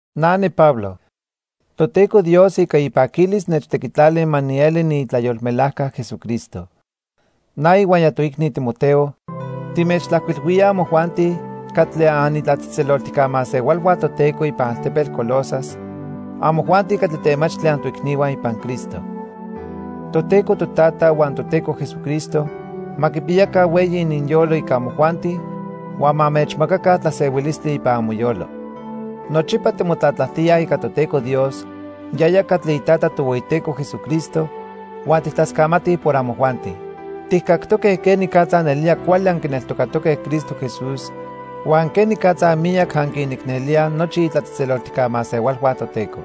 Na niPablo. Toteco Dios ica ipaquilis nechtequitlali ma nieli niitlayolmelajca Jesucristo. Na ihuaya toicni Timoteo, timechtlajcuilhuíaj amojuanti catli anitlatzejtzeloltijca masehualhua Toteco ipan altepetl Colosas, amojuanti catli temachtli antoicnihua ipan Cristo. Toteco Totata huan Toteco Jesucristo ma quipiyaca hueyi ininyolo ica amojuanti huan ma anmechmacaca tlasehuilistli ipan amoyolo. Nochipa timotlatlajtíaj ica Toteco Dios, yaya catli iTata Tohueyiteco Jesucristo huan tijtlascamatij por amojuanti. Tijcactoque quenicatza nelía cuali anquineltocatoque Cristo Jesús huan quenicatza miyac anquinicnelíaj nochi itlatzejtzeloltijca masehualhua Toteco.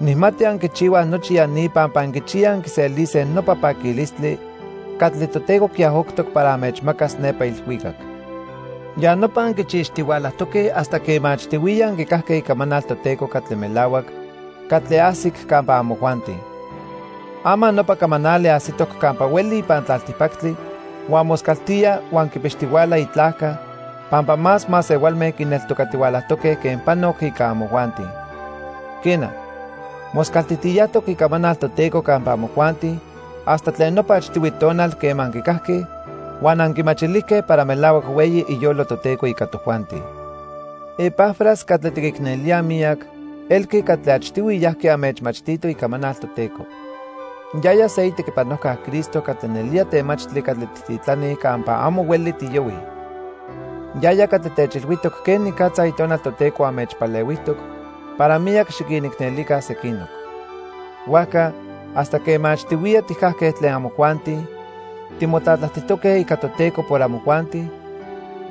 Nijmati anquichihuaj nochi ya ni pampa anquichiyaj anquiselise nopa paquilistli catli Toteco quiajoctoc para anmechmacas nepa ilhuicac. Ya nopa anquichixtihualajtoque hasta quema achtihuiya anquicajque icamanal Toteco catli melahuac, catli ajsic campa amojuanti. Ama nopa camanali ajsitoc campa hueli ipan tlaltipactli huan moscaltía huan quipixtihuala itlajca pampa más masehualme quineltocatihualajtoque quen panoc ica amojuanti. Quena, moscaltijtiyajtoc icamanal Toteco campa amojuanti hasta tlen nopa achtihui tonal quema anquicajque huan anquimachilijque para melahuac hueyi iyolo Toteco ica tojuanti. Epafras catli tiquicnelíaj miyac elqui catli achtihui yajqui anmechmachtito icamanal Toteco. Yaya se itequipanojca Cristo catli nelía temachtli catli tijtitlanij campa amo hueli tiyohuij. Yaya catli techilhuijtoc quenicatza Itonal Toteco anmechpalehuijtoc para miyac xiquinicnelica sequinoc. Huajca, hasta quema achtihuiya tijcajque tlen amojuanti timotlatlajtijtoque ica Toteco por amojuanti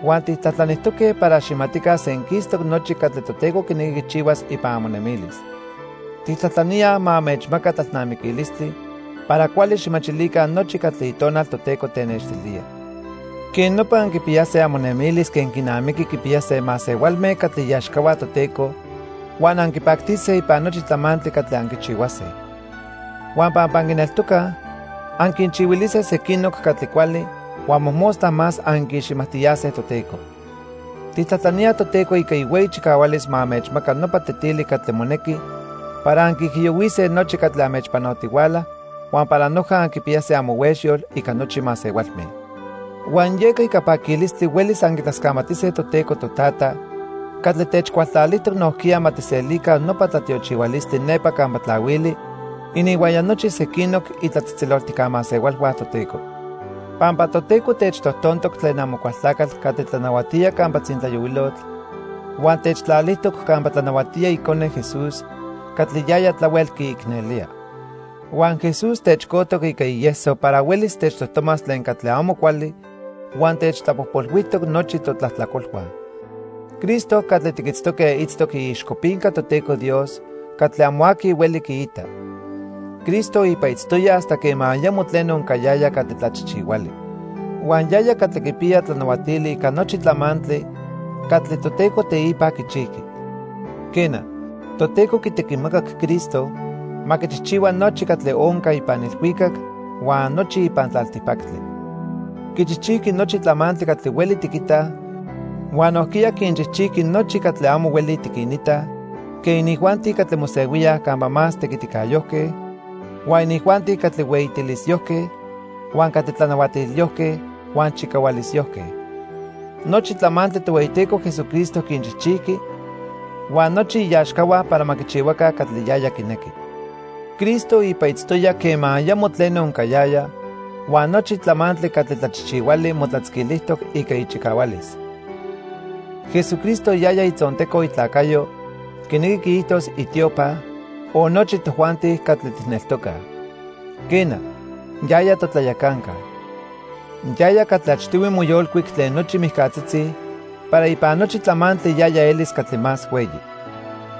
huan tijtlajtlanijtoque para xijmatica senquistoc nochi catli Toteco quinequi quichihuas ipan amonemilis. Tijtlajtlaníaj ma anmechmaca tlalnamiquilistli para cuali xijmachilica nochi catli Itonal Toteco tenextilía. Quej nopa anquipiyase amonemilis quen quinamiqui quipiyase masehualme catli iaxcahua Toteco huan anquipactise ipan nochi tlamantli catli anquichihuase. Huan pampa anquineltocaj, anquinchihuilise sequinoc catli cuali huan mojmostla más anquiiximajtiyase Toteco. Tijtlajtlaníaj Toteco ica ihueyi chicahualis ma anmechmaca nopa tetili catli monequi para anquiijiyohuise nochi catli anmechpanotihuala huan para noja anquipiyase amohuexyol ica nochi masehualme. Huan yeca ica paquilistli huelis anquitlascamatise Toteco Totata catli techcualtlalijtoc nojquiya ma tijselica nopa tlatiochihualistli nepa campa tlahuili ininhuaya nochi sequinoc itlatzejtzeloltijca masehualhua Toteco. Pampa Toteco techtojtontoc tlen Amocualtlacatl catli tlanahuatía campa tzintlayohuilotl huan techtlalijtoc campa tlanahuatía Icone, Jesús, catli yaya tlahuel quiicnelía. Huan Jesús techcojtoc ica ieso para huelis techtojtomas tlen catli amo cuali huan techtlapojpolhuijtoc nochi totlajtlacolhua. Cristo catli tiquitztoque itztoc iixcopinca Toteco Dios catli amo aqui hueli quiita. Cristo ipa itztoya hasta quema ayamo tleno oncayaya catli tlachijchihuali. Huan yaya catli quipiya tlanahuatili ica nochi tlamantli catli Toteco teipa quichijqui. Quena, Toteco quitequimacac Cristo ma quichijchihua nochi catli onca ipan ilhuicac huan nochi ipan tlaltipactli. Quichijchijqui nochi tlamantli catli hueli tiquitaj huan nojquiya quinchijchijqui nochi catli amo hueli tiquinitaj quen inijuanti catli mosehuíaj campa más tequiticayojque, huan inijuanti catli hueyitilisyojque, huan catli tlanahuatilyojque huan chicahualisyojque. Nochi tlamantli Tohueyiteco Jesucristo quinchijchijqui huan nochi iaxcahua para ma quichihuaca catli yaya quinequi. Cristo ipa itztoya quema ayamo tleno oncayaya huan nochi tlamantli catli tlachijchihuali motlatzquilijtoc ica ichicahualis. Jesucristo yaya itzonteco itlacayo, quinequi quiijtos itiopa, o nochi tojuanti catli tijneltocaj. Quena, yaya totlayacanca. Yaya catli achtihui moyolcuic tlen nochi mijcatzitzi para ipan nochi tlamantli yaya elis catli más hueyi.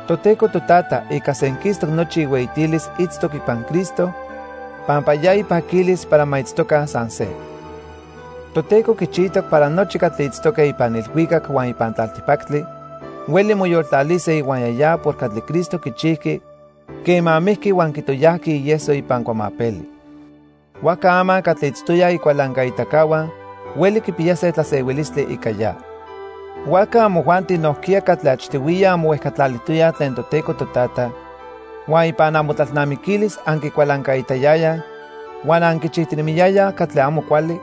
Toteco Totata ica senquistoc nochi ihueyitilis itztoc ipan Cristo pampa ya ipaquilis para ma itztoca san se. Toteco quichijtoc para nochi catli itztoque ipan ilhuicac huan ipan tlaltipactli hueli moyoltlalise ihuaya ya por catli Cristo quichijqui quema mijqui huan quitoyajqui ieso ipan cuamapeli. Huajca ama catli itztoyaj icualancaitacahua hueli quipiyase tlasehuilistli ica ya. Huajca amojuanti nojquiya catli achtihuiya anmohuejcatlalijtoyaj tlen Toteco Totata, huan ipan amotlalnamiquilis anquicualancaitayayaj huan anquichijtinemiyayaj catli amo cuali,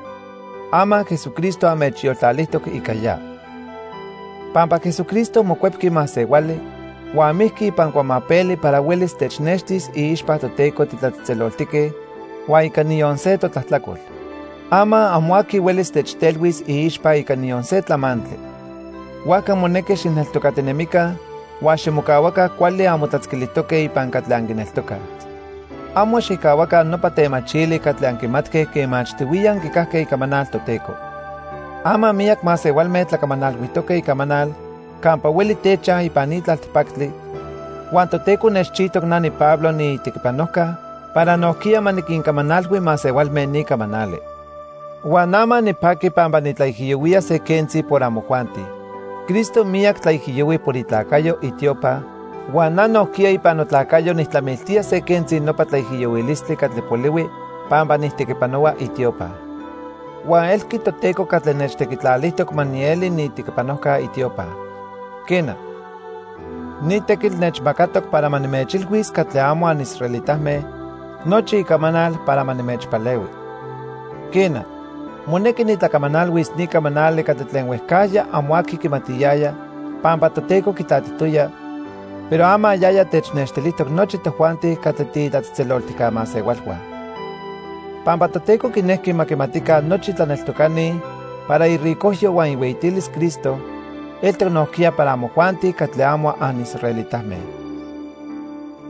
ama Jesucristo anmechyoltlalijtoc ica ya. Pampa Jesucristo mocuepqui masehuali huan mijqui ipan cuamapeli para huelis technextis iixpa Toteco titlatzejtzeloltique huan ica niyon se totlajtlacol. Ama amo aqui huelis techtelhuis iixpa ica niyon se tlamantli. Huajca monequi xijneltocatinemica huan ximocahuaca cuali anmotlatzquilijtoque ipan catli anquineltocaj. Amo xijcahuaca nopa temachili catli anquimatque quema achtihuiya anquicajque icamanal Toteco. Ama miyac masehualme tlacamanalhuijtoque icamanal campa hueli techaj ipan ni tlaltipactli huan Toteco nechchijtoc na niPablo niitequipanojca para nojquiya ma niquincamanalhui masehualme ni camanali. Huan ama nipaqui pampa nitlaijiyohuía se quentzi por amojuanti. Cristo miyac tlaijiyohui por itlacayo, itiopa, huan na nojquiya ipan notlacayo nijtlamiltía se quentzi nopa tlaijiyohuilistli catli polihui pampa nijtequipanohua itiopa. Huan elqui Toteco catli nechtequitlalijtoc ma nieli niitequipanojca itiopa. Quena, ni tequitl nechmacatoc para ma nimechilhuis catli amo anisraelitame nochi icamanal para ma nimechpalehui. Quena, monequi nitlacamanalhuis ni camanali catli tlen huejcajya amo aqui quimatiyaya pampa Toteco quitlatijtoya, pero ama yaya technextilijtoc nochi tojuanti catli tiitlatzejtzeloltijca masehualhua. Pampa Toteco quinejqui ma quimatica nochi tlaneltocani para iricojyo huan ihueyitilis Cristo eltoc nojquiya para amojuanti catli amo anisraelitame.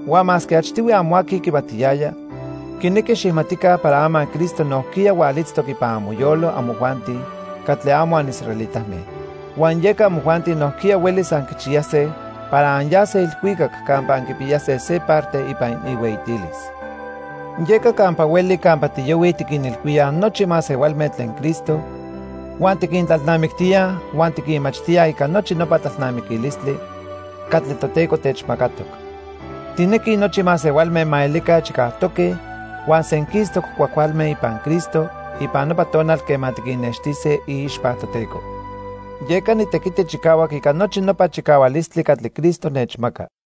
Huan masque achtihui amo aqui quimatiyaya, quinequi xijmatica para ama Cristo nojquiya hualitztoc ipan amoyolo amojuanti catli amo anisraelitame, huan yeca amojuanti nojquiya huelis anquichiyase para anyase ilhuicac campa anquipiyase se parte ipan ihueyitilis. Yeca campa hueli campa tiyohuij tiquinilhuíaj nochi masehualme tlen Cristo huan tiquintlalnamictíaj huan tiquinmachtíaj ica nochi nopa tlalnamiquilistli catli Toteco techmacatoc. Tijnequij nochi masehualme ma elica chicajtoque huan senquistoc cuajcualme ipan Cristo ipan nopa tonal quema tiquinnextise iixpa Toteco. Yeca nitequiti chicahuac ica nochi nopa chicahualistli catli Cristo nechmaca.